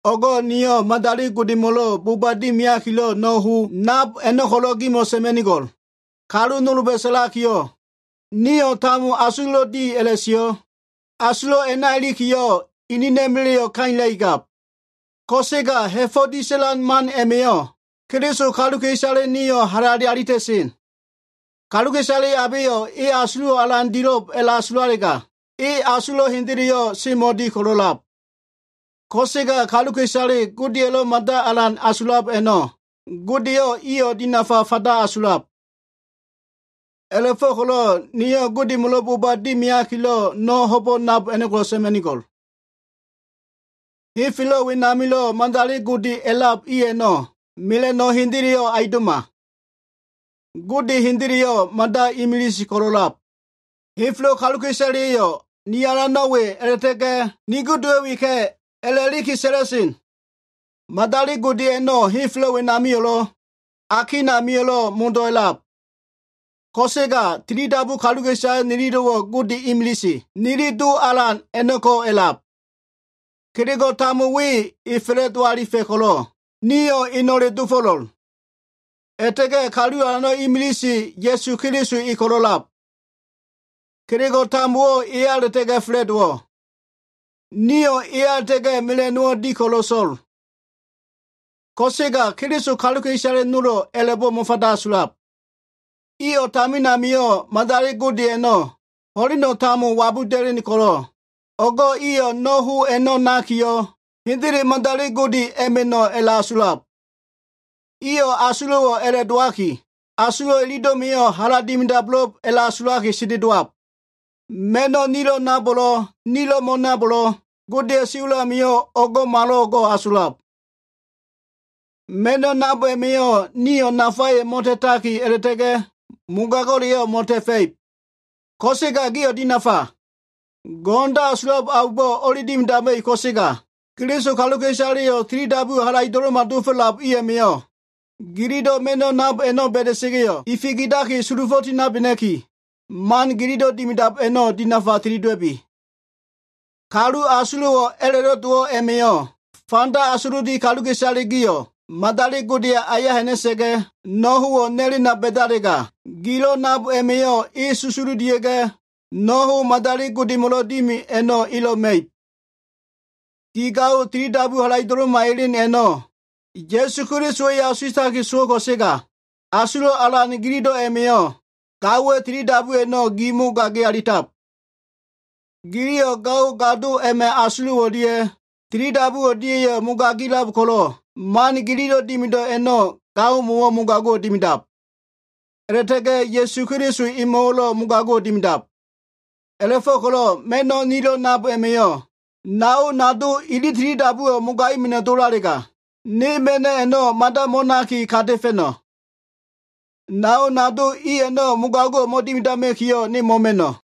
O꞉go꞉ niyo꞉ madali godemo꞉lo꞉ boba dimiakilo꞉ no꞉ ho nab a꞉no꞉ ko꞉lo꞉ gimo꞉ sa꞉ma꞉nigo꞉l. Kalu nolba꞉ sa꞉lakiyo꞉, “Nio꞉ tambo asulo꞉lo꞉ di,” a꞉la꞉sio꞉. Asulo꞉ a꞉ma꞉ ilikiyo꞉ enena꞉ma꞉la꞉yo꞉ kailakigab. Ko꞉sega ha꞉fo꞉ disa꞉lan man a꞉ma꞉yo꞉ Keliso kaluka꞉isale nio꞉ halale alita꞉sen. Kaluka꞉isale abeyo꞉ e asulo꞉wo꞉ alan dilo꞉b a꞉la꞉asulalega, e asulo꞉ hendeleyo꞉ semo꞉di ko꞉lo꞉lab. Ko꞉sega kaluka꞉isale Godelo꞉ mada alan asulab a꞉no꞉, Gode eyo꞉ iyo꞉ dinafa fanda asulab. A꞉la꞉fo꞉ko꞉lo꞉ niyo꞉ madali godemo꞉lo꞉ boba dimiakilo꞉ no꞉ ho nab a꞉no꞉ ko꞉lo꞉ sa꞉ma꞉nigo꞉l. Henfelo꞉ wenamilo꞉ madali gode a꞉lab i a꞉no꞉ mela꞉no꞉ hendeleyo꞉ aundo꞉ma. Gode hendeleyo꞉ mada imilise ko꞉lo꞉lab. Henfelo꞉ kaluka꞉isaleya꞉yo꞉ “Ni alano꞉ we” a꞉la꞉ta꞉ga꞉ “Ni godeyo꞉ weka꞉” a꞉la꞉liki sa꞉la꞉sen. Madali gode a꞉no꞉ henfelo꞉ wenamio꞉lo꞉, akin amio꞉lo꞉ modo꞉ a꞉lab. Ko꞉sega, tilidabu kaluka꞉isale nililo꞉wo꞉ Gode imilise, nili Do Alan a꞉no꞉ko꞉ a꞉lab. Kelego꞉ tambo we e fa꞉la꞉do alifa꞉ ko꞉lo꞉, nio꞉ eno꞉le dofo꞉lo꞉l. A꞉la꞉ta꞉ga꞉ Kalu Alano꞉ imilise, Ya꞉su Keliso e ko꞉lo꞉ a꞉lab. Kelego꞉ tambowo꞉ eya a꞉la꞉ta꞉ga꞉ fa꞉la꞉dowo꞉. Nio꞉ eya a꞉la꞉ta꞉ga꞉ mela꞉no꞉wo꞉ di ko꞉lo꞉ so꞉l. Ko꞉sega Keliso kaluka꞉isale nolo꞉ a꞉la꞉bo꞉ mo꞉fanda asulab. Iyo꞉ tamin amio꞉ madali gode a꞉no꞉ ho꞉leno꞉ tambo wabuda꞉len ko꞉lo꞉, o꞉go꞉ iyo꞉ no꞉ ho a꞉no꞉ nakiyo꞉, hendele madali gode a꞉ma꞉no꞉ a꞉la꞉asulab. Iyo꞉ asulo꞉wo꞉ a꞉la꞉ dowaki, asulo꞉ ililo꞉ma꞉yo꞉ hala dimido꞉bo꞉lo꞉b a꞉la꞉asulaki sendelowab. Ma꞉no꞉ nilo꞉ nabo꞉lo꞉, nilo꞉ mo꞉nabo꞉lo꞉, Godeya꞉ siwa꞉l amio꞉ o꞉ngo꞉malo꞉ngo꞉ asulab. Ma꞉no꞉ nab a꞉ma꞉yo꞉ nio꞉ nafayo꞉ mo꞉ta꞉taki, a꞉la꞉ta꞉ga꞉ mogago꞉leyo꞉ mo꞉ta꞉fa꞉ib. Ko꞉sega gio꞉ dinafa! Go꞉no꞉ndo꞉ asulab aumbo꞉ o꞉li dimidama꞉ib ko꞉sega, Keliso kaluka꞉isaleyo꞉ tilidabuwo꞉ halaido꞉lo꞉ma dofo꞉lab i a꞉ma꞉yo꞉, gililo꞉ ma꞉no꞉ nab a꞉no꞉ ba꞉da꞉sa꞉ga꞉yo꞉ ifikidaki sulufo꞉ tinabena꞉ki, man gililo꞉ dimidab a꞉no꞉ dinafa tilidowa꞉bi. Kalu asulo꞉wo꞉ a꞉la꞉lo꞉ dowo꞉ a꞉ma꞉yo꞉, fanda asululi kaluka꞉isale gio꞉ madali godeya꞉ aya ha꞉na꞉sa꞉ga꞉, no꞉ howo꞉ nalena ba꞉dalega, gilo꞉ nab a꞉ma꞉yo꞉ e susululia꞉ga꞉, no꞉ ho madali godemo꞉lo꞉ dimi a꞉no꞉ elo꞉ ma꞉ib. Gi gaowa꞉ tilidabuwo꞉ halaido꞉lo꞉ma elen a꞉no꞉, Ya꞉su Keliso e asuwa꞉taki sowo꞉ ko꞉sega, asulo꞉ alan gililo꞉ a꞉ma꞉yo꞉ gaowa꞉ tilidabu a꞉no꞉ gi mogagi alitab. Giliyo꞉ gao gado a꞉ma꞉ asulo꞉ o꞉lia꞉ tilidabu o꞉lia꞉yo꞉ mogagilab ko꞉lo꞉, man gililo꞉ dimido꞉ a꞉no꞉ gaomo꞉wo꞉ mogago꞉ dimidab. A꞉la꞉ta꞉ga꞉ Ya꞉su Keliso emo꞉wo꞉lo꞉ mogago꞉ dimidab. A꞉la꞉fo꞉ko꞉lo꞉ ma꞉no꞉ nilo꞉ nab a꞉ma꞉yo꞉ nao nado ili tilidabuwo꞉ mogaima꞉no꞉ dowo꞉lalega, ne ma꞉no꞉ a꞉no꞉ mada mo꞉naki kata꞉fa꞉no꞉. Nao nado i a꞉no꞉ mogago꞉wo꞉ mo꞉dimidama꞉kiyo꞉, ne mo꞉ma꞉no꞉.